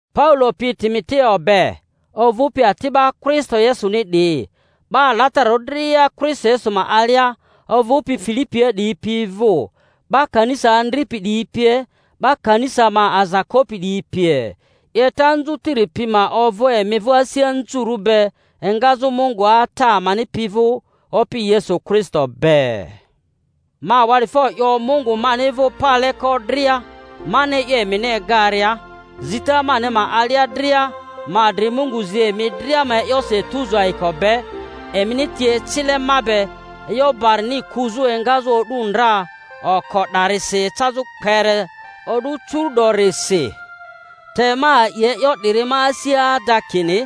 Paulo pi Timoteo be, ovᴜpi ati'ba Kristo Yesuni 'diyi, 'Ba alatararᴜ dria Kristo Yesu ma alia ovᴜpi Filipia 'diyi pi vᴜ, 'ba kanisa andripi 'diyi pie, 'ba kanisa ma aza kopi 'diyi pie: 'Yeta anzutiri pi ma ovᴜ emi vᴜ asi anzurᴜ be engazᴜ Mungu Ata amani pi vᴜ Opi Yesu Kristo be. Ma awa'difo 'yo Mungu mani vᴜ paleko dria mani e'yo emini egaria, zita mani ma alia dria ma adri Mungu zi emi dria ma e'yosi etuzu ayiko be, emini ti ecile ma be e'yo barini kuzᴜ engazᴜ o'du ndra oko 'darisi ecazᴜ kpere o'du curu'dorisi. Te ma a'i e'yo 'diri ma asia ada kini,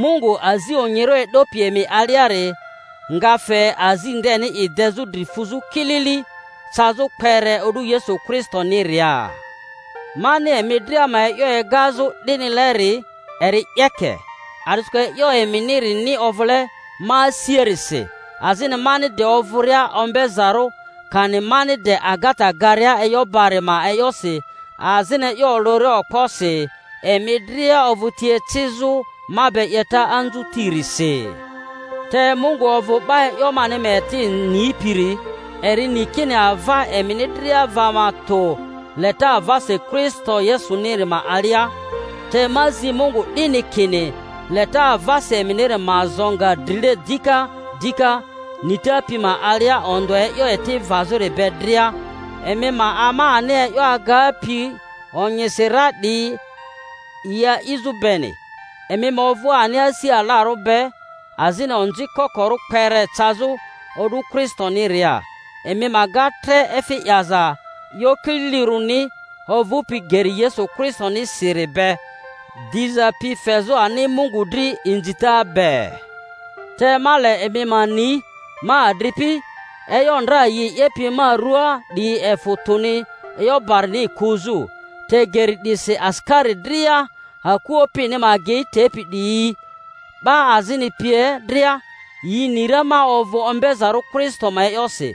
Mungu azi onyirᴜ e'dopi emi aliari nga fe azi ndeni i dezᴜ dri fuzᴜ kilili cazᴜ kpere o'du Yesu Kristoniria. Mani emi dria ma e'yo egazᴜ 'dinileri eri 'yeke, a'disikᴜ e'yo eminirini ovᴜle ma asiarisi, azini mani de ovᴜria ombe-zarᴜ kani mani de agata garia e'yo bari ma e'yosi azini e'yo olᴜria okposi, emi dria ovᴜ ti ecizᴜ ma be 'yeta anzutirisi. Te Mungu ovᴜ 'ba e'yo mani ma eti nipiri, eri ni kini ava emini dria va ma tᴜ leta avasi Kristo Yesuniri ma alia. Te ma zi Mungu 'dini, kini, leta avasi eminiri ma zo nga drile dika dika nita pi ma alia ondᴜa e'yo eti vazᴜri be dria, emi ma ama ani e'yo agapi onyisi ra 'diyi yi a'izᴜ beni, emi ma ovᴜ ani asi alarᴜ be azini onzi kokorᴜ kpere cazᴜ o'du Kristo-niria, emi ma ga tre efi 'yaza e'yo kililirᴜni ovᴜpi geri Yesu Kristonisiri be, diza pi fezᴜ ani Mungu dri inzita be. Te ma le emi ma ni, ma adripi, e'yo ndra yi 'yepi ma ruaa 'diyi efᴜ tᴜni e'yo barini kuzᴜ, te geri 'disi asikari dria aku opini ma agei tepi 'diyi, 'ba azini pie dria, yi ni ra ma ovᴜ ombezarᴜ Kristo ma e'yosi;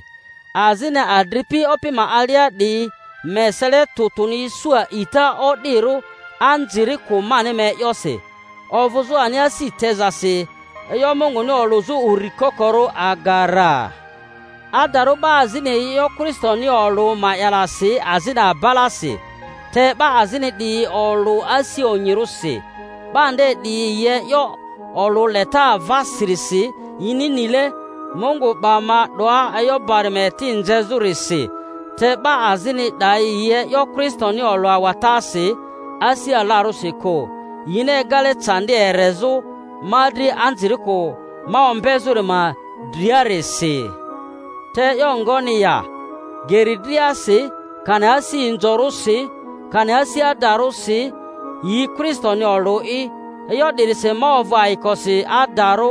azini adripi Opi ma alia 'diyi ma esele tᴜ tᴜni isu a'ita o'dirᴜ anzirikᴜ mani ma e'yosi, ovᴜzᴜ ani asi tezasi e'yo Munguni olᴜzᴜ uri kokorᴜ aga ra. Adarᴜ 'ba azini yi e'yo Kristoni olᴜ ma'yalasi azini abalasi, te 'ba azini 'diyi olᴜ asi onyirᴜsi. 'Ba nde 'diyi yi e'yo olᴜ leta avasirisi yini nile Mungu 'ba ma 'doa e'yo bari ma eti nzezᴜrisi; te 'ba azini 'dayi yi e'yo Kristoni olᴜ awatasi, asi alarᴜsi kᴜ, yini egale candi erezᴜ ma dri anzirikᴜ ma ombezᴜri ma driarisi. Te e'yo ngoni ya? Geri driasi, kani asi inzorᴜsi, kani asi adarᴜsi, yi Kristoni olᴜ'i; e'yo 'dirisi ma ovᴜ ayikosi, adarᴜ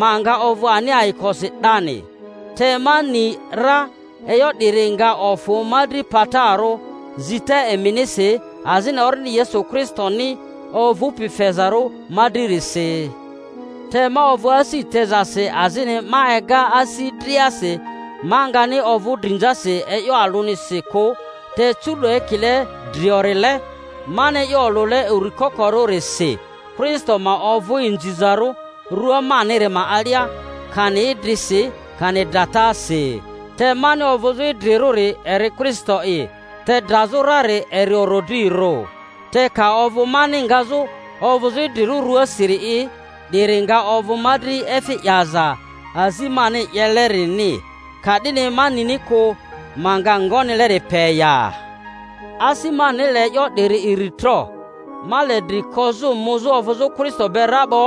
ma nga ovᴜ ani ayikosi 'dani. Te ma ni ra e'yo 'diri nga ofᴜ ma dri patarᴜ, zita eminisi azini Orindi Yesu Kristoni ovᴜpi fezarᴜ ma dririsi; te ma ovᴜ asi tezasi azini ma ega asi driasi ma ngani ovᴜ drinzasi e'yo alᴜnisi kᴜ, te curu'do ekile driorile, mani e'yo olᴜle uri kokorᴜrisi, Kristo ma ovᴜ inzizarᴜ rua maniri ma alia, kani idrisi, kani dratasi. Te mani ovᴜzᴜ idrirᴜri eri Kristo'i, te drazᴜ rari eri orodrirᴜ. Te ka ovᴜ mani ngazᴜ ovᴜzᴜ idrirᴜ ruasiri'i, 'diri nga ovᴜ ma dri efi 'yaza azi mani 'yelerini. Ka'dini ma nini kᴜ ma nga ngonileri pe ya. Asi mani le e'yo 'diyi iri tro. Ma le dri kozᴜ muzᴜ ovᴜzᴜ Kristo be ra 'bo,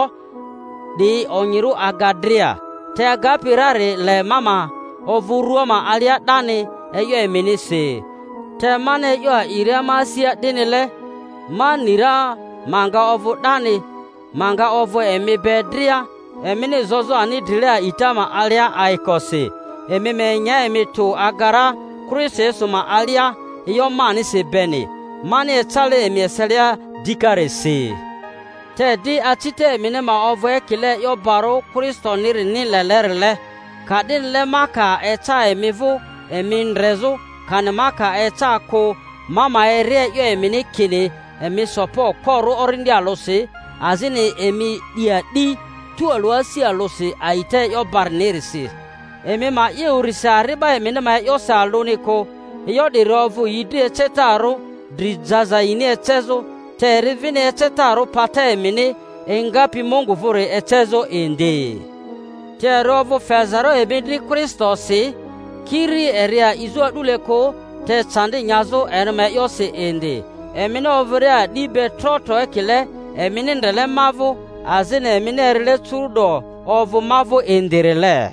'di onyirᴜ aga dria. Te agapi rari le ma ma ovᴜ rᴜa ma alia 'dani e'yo eminisi. Te mani e'yo a'iria ma asia 'dinile ma ni ra ma nga ovᴜ 'dani, ma nga ovᴜ emi be dria emini zozᴜ ani drile a'ita ma alia ayikosi, emi ma enya emi tᴜ aga ra Kristo Yesu ma alia e'yo manisi beni, mani ecale emi eselia dikarisi. Te di, acita emini ma ovᴜ ekile e'yo barᴜ Kristonirini lelerile, ka'dinile ma ka eca emi vᴜ emi ndrezᴜ, kani ma ka eca kᴜ, ma ma eri e'yo emini, kini, emi so pa okporᴜ orindi alᴜsi, azini emi 'di a'di tualᴜ asi alᴜsi a'ita e'yo barinirisi; emi ma 'ye urisi ari'ba emini ma e'yosi alᴜni kᴜ. E'yo 'diri ovᴜ yi dri ecetarᴜ dri jaza yini ecezᴜ, te eri vini ecetarᴜ pata emini engapi Mungu vᴜri ecezᴜ indi. Te eri ovᴜ fezarᴜ emi dri Kristosi, kiri eri a'izᴜ a'dule kᴜ, te candi nyazᴜ eri ma e'yosi indi, emini ovᴜria a'di be tro tro ekile emini ndrele ma vᴜ, azini emini erile curu'do ovᴜ ma vᴜ indirile.